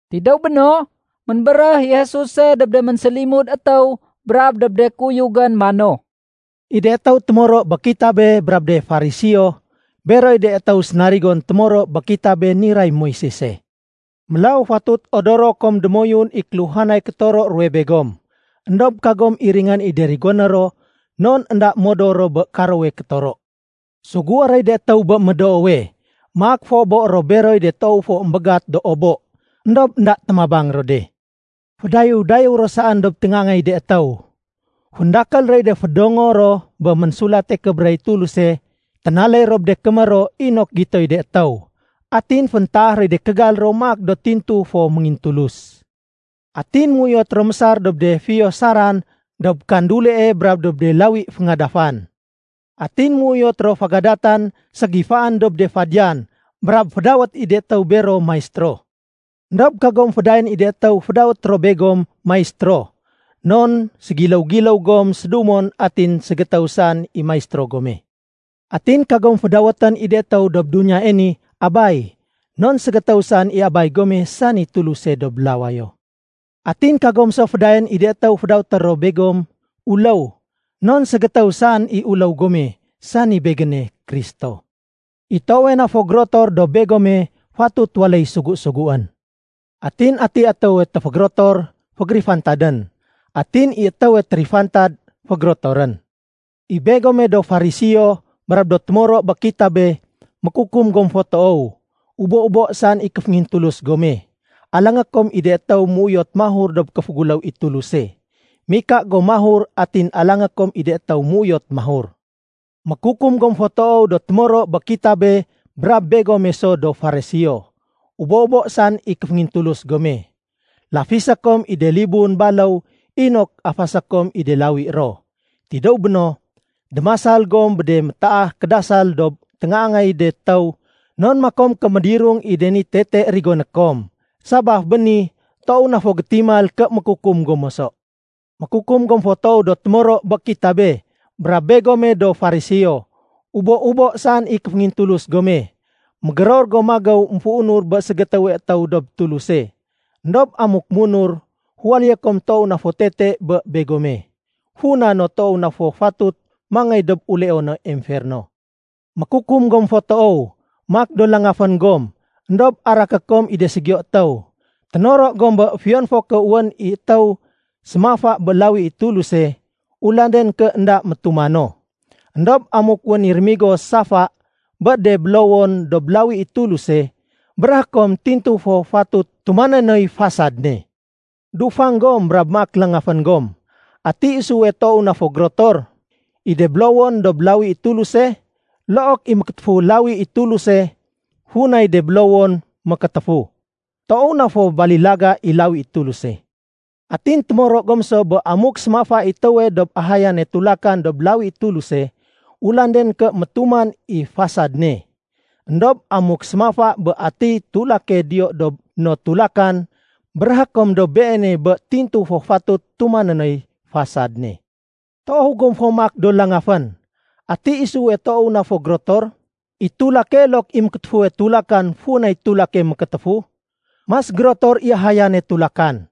Tidéw béno, ménbéréh i Jesuse dob de ménsélimud étéw brab dob de kuyugén mano, “I de témoro bé kitabe brab de Fariseo, beroy de étéw sénarigon témoro bé kitabé niray Moisese. Mélaw fatut odoro kom démoyun i kéluhanay kétoro ruwe begom. Endob kagom iringén i de rigoné ro non énda modor ro bé karowe kétoro. Sugué roy de étéw bé médoowe, maak féobo ro beroy de toow fo émbégat do obo, éndob énda témabang ro de. Fédayéw-dayéw ro saén dob téngaangay de étéw. Féndakél roy de fédongo ro bé Ménsulate Kébéréh i Tuluse ténaléy ro bé de kémér ro inok gitoy de étéw. Atin féntaah roy de kégal ro maak do tintu fo méngintulus. Atin méuyot ro mésar dob de fiyo saran dob kandulie brab dob de lawi féngadafan. Atin méuyot ro fégadatan ségifaén dob de fadiyan brab fédawét i de étéw bero ‘Maistéro.’ Endob kagom fédayaén i de étéw fédawét ro begom ‘Maistéro’, non fantay-fantay gom sédumon atin ségétéw saén i Maistéro gome. Atin kagom fédawét i de étéw dob duniyae ni ‘Abay’, non ségétéw saén i Abay gome sani Tuluse dob lawayo. Atin kagom so fédayaén i de étéw fédawét ro begom ‘Uléw’, non ségétéw saén i Uléw gome sani Begéne, Kristo. I toowe na fo gérotor dob begome fatut waléy sugu-suguén. Atiy étéwe téfégérotor, fégérifantadén. Atin i étéwe térifantad, fégérotorén. “I begome do Fariseo brab do témoro bé kitabé, mékukum gom fo toow. Ubo-ubo saén i kéféngintulus gome. Alangé kom i de étéw méuyot mahur dob kéféguléw i Tuluse. Mika gom mahur atin alangé kom i de étéw méuyot mahur. Mékukum gom fo toow do témoro bé kitabe brab begome so do Fariseo. Ubo-ubo saén i kéféngintulus gome. Lafisé kom i de libun baléw inok afasé kom i de lawi ro. Tidéw béno, démasal gom bé de métaah kédasal dob téngaangay de étéw non makom ké médirung i de ni tete rigoné kom. Sabaf bé ni toow na fo gétimal ké mékukum gom moso. “Mékukum gom fo toow do témoro bé kitabe brab begome do Fariseo. Ubo-ubo saén i kéféngintulus gome. Mégéror gom magéw émféunur bé ségétéwe étéw dob Tuluse. Endob amuk munur, féwaléyé kom toow na fo tete bé begome, funa no toow na fo fatut mangéy dob uleono emferno. “Mékukum gom fo toow. Maak do langafén gom éndob araké kom i de ségiyo étéw. Ténoro gom bé fiyon fo ké wén i étéw sémafa bé lawi i Tuluse, ulanden ké énda métuma no. Endob amuk wén i rémigo safa bé de bélowon dob lawi i Tuluse, béréhé kom tintu fo fatut tumané noy fasad ne. Dufang gom brab maak langafén gom. Ati isuwe toow na fo gérotor, i de bélowon dob lawi i Tuluse look i mékétéfuwe lawi i Tuluse funay de bélowon mékétéfu? Toow na fo balilaga i lawi i Tuluse. Atin témoro gom so bé amuk sémafa i étéwe dob ahayane tulakan dob lawi i Tuluse, ulanden ké métuman i fasad ne. Endob amuk sémafa bé atiy tulake diyo dob no tulakan béréhé kom dob beene bé tintu fo fatut tumané noy fasad ne. Toow gom fo maak do langafén! Ati isuwe toow na fo gérotor, i tulake look i mékétéfuwe tulakan funay tulake mékétéfu? Mas gérotor i ahayane tulakan.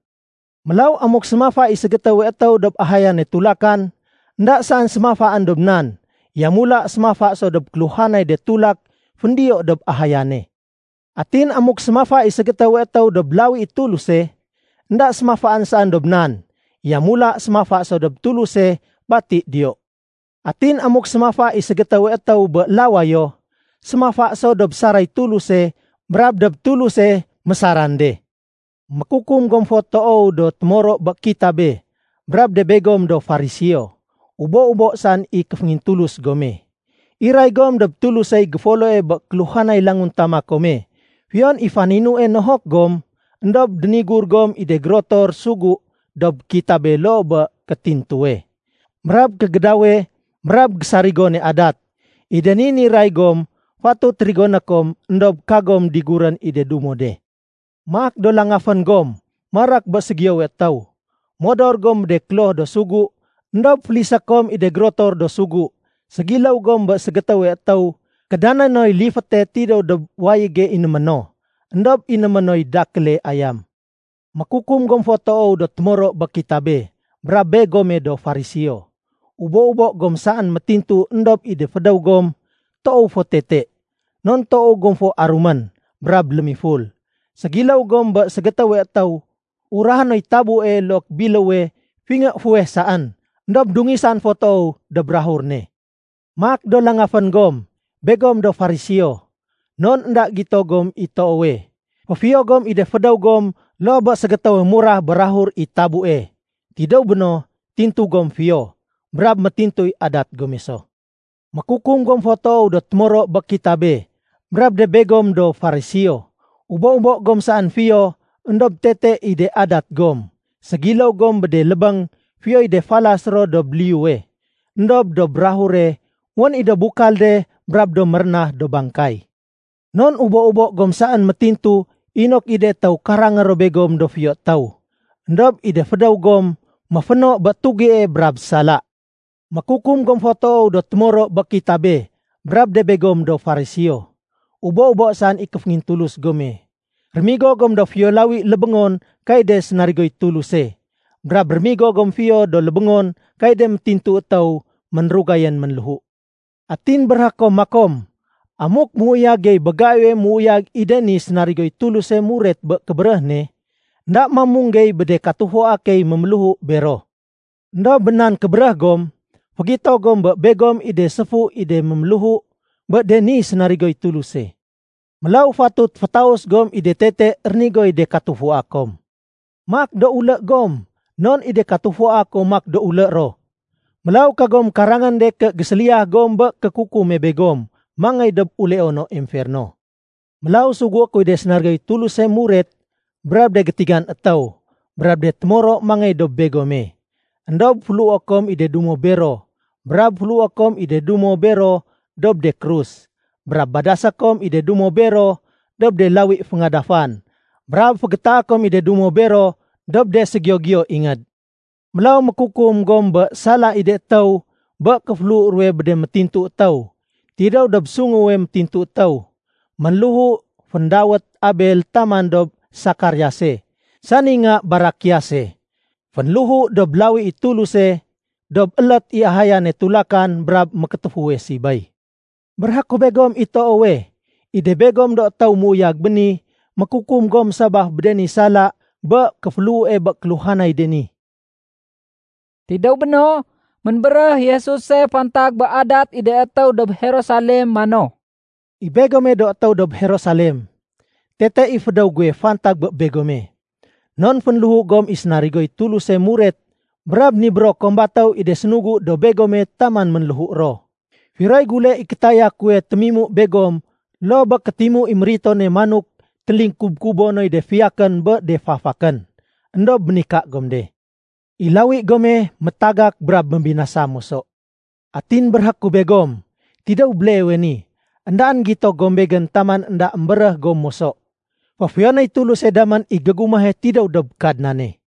Mélaw amuk sémafa i ségétéwe étéw dob ahayane tulakan, énda saén sémafaén dob nan, yamula sémafa so dob kéluhanay de tulak féndiyo dob ahayane. Atin amuk sémafa i ségétéwe étéw dob lawi i Tuluse, énda sémafaén saén dob nan, yamula sémafa so dob Tuluse bati diyo. Atin amuk sémafa i ségétéwe étéw bé lawayo, sémafa so dob saray Tuluse brab dob Tuluse mésaran de. “Mékukum gom fo toow do témoro bé kitabé brab de begom do Fariseo. Ubo-ubo saén i kéféngintulus gome. Iray gom dob Tulusey géfoloe bé kéluhanay languntama kome fiyon i faninue nohok gom, éndob dénigur gom i de gérotor sugu dob kitabe loo bé kétintuwe, brab kégédawe, brab gésarigone adat. I de ni niray gom fatut rigoné kom éndob kagom digurén i de dumo de. Maak do langafén gom marak bé ségiyowe étéw! Modor gom bé de kloh do sugu éndob félisé kom i de gérotor do sugu. Ségiléw gom bé ségétéwe étéw kédané noy liféte tidéw dob wayége inémé no, éndob inémé noy dakéle ayam. “Mékukum gom fo toow do témoro bé kitabe brab begome do Fariseo. Ubo-ubo gom saén métintu éndob i de fédéw gom toow fo tete. Non toow gom fo arumén brab lémiful. Ségiléw gom bé ségétéwe étéw urahé noy tabue look biléwe fingé fuweh saén éndob dungisan fo toow dob bukag ne. Maak do langafén gom, begom do Fariseo, non énda gito gom i toowe. Féfiyo gom i de fédéw gom loo bé ségétéwe murah bé bukag i tabue. Tidéw béno, tintu gom fiyo, brab métintuy adat gome so. “Mékukum gom fo toow do témoro bé kitabe brab de begom do Fariseo. Ubo-ubo gom saén fiyo éndob tete i de adat gom. Ségiléw gom bé de lébéng fiyoy de falas ro dob liyuwe, éndob dob bukage wén i do bukal de brab do mérénah do bangkay. Non ubo-ubo gom saén métintu inok i de étéw karangé ro begom do fiyo étéw. Endob i de fédéw gom méféno bé tugie brab sala. “Mékukum gom fo toow do témoro bé kitabe brab de begom do Fariseo. Ubo-ubo saén i kéféngintulus gome. Rémigo gom do fiyo lawi lébéngon kay de sénarigoy Tuluse, brab rémigo gom fiyo do lébéngon kay de métintu étéw ménrugayén ménléhu. Atin béréhé kom makom, ‘Amuk méuyag gey bé gaiwe méuyag i de ni sénarigoy Tuluse muret bé kébéréh ne, énda mamung gey bé de katufua key méméléhu bero.’ Endob bé nan kébéréh gom, fégito gom bé begom i de séfu i de ménméléhu bé de ni sénarigoy Tuluse. Mélaw fatut fétaus gom i de tete rénigoy de katufua kom. Maak do ulé gom non i de katufua kom maak do ulé ro. Mélaw kagom karangén de ké géséliya gom bé kékukume begom mangéy dob uleono emferno. Mélaw sugué kuy de sénarigoy Tuluse muret, brab de gétigan étéw, brab de témoro mangéy dob begome. Endob féléhué kom i de dumo bero, brab féléhué kom i de dumo bero dob de krus, brab badasé kom i de dumo bero dob de lawi féngadafan, brab fégétaé kom i de dumo bero dob de ségiyo-giyo ingéd. Mélaw mékukum gom bé sala i de étéw bé kéféléhu ruwe bé de métintu étéw, tidéw dob sunguwe métintu étéw ménléhu féndawét Abel taman dob Sekariase sani nga Barakiase. Fénléhu dob lawi i Tuluse dob élét i ahayane tulakan brab mékétéfuwe sibéy. Béréhé ku begom i toowe, i de begom do étéw méuyag béni mékukum gom sabaf bé de ni sala bé kéféléhue bé kéluhanay de ni.” Tidéw béno, ménbéréh i Jesuse fantag bé adat i de étéw dob Jerusalem mano, “I Begome do étéw dob Jerusalem, tete i fédéw guwe fantag bé begome. Non fénléhu gom i de sénarigoy Tuluse muret brab nibéro kom batéw i de sénugu dob begome taman ménléhu ro. Firoy gule i kétaya kuwe témimu begom loo bé kétimu i méritone manok télikub-kubo noy de fiyakén bé de fafakén? Endob ménika gom de. I lawi gome métagak brab mébinasa moso. Atin béréhé ku begom, tidéw béleewe ni, éndaén gito gom Begén taman énda émbéréh gom moso, ‘Féfiyonéy Tuluse damén i gégumahe tidéw dob Kadnane.’”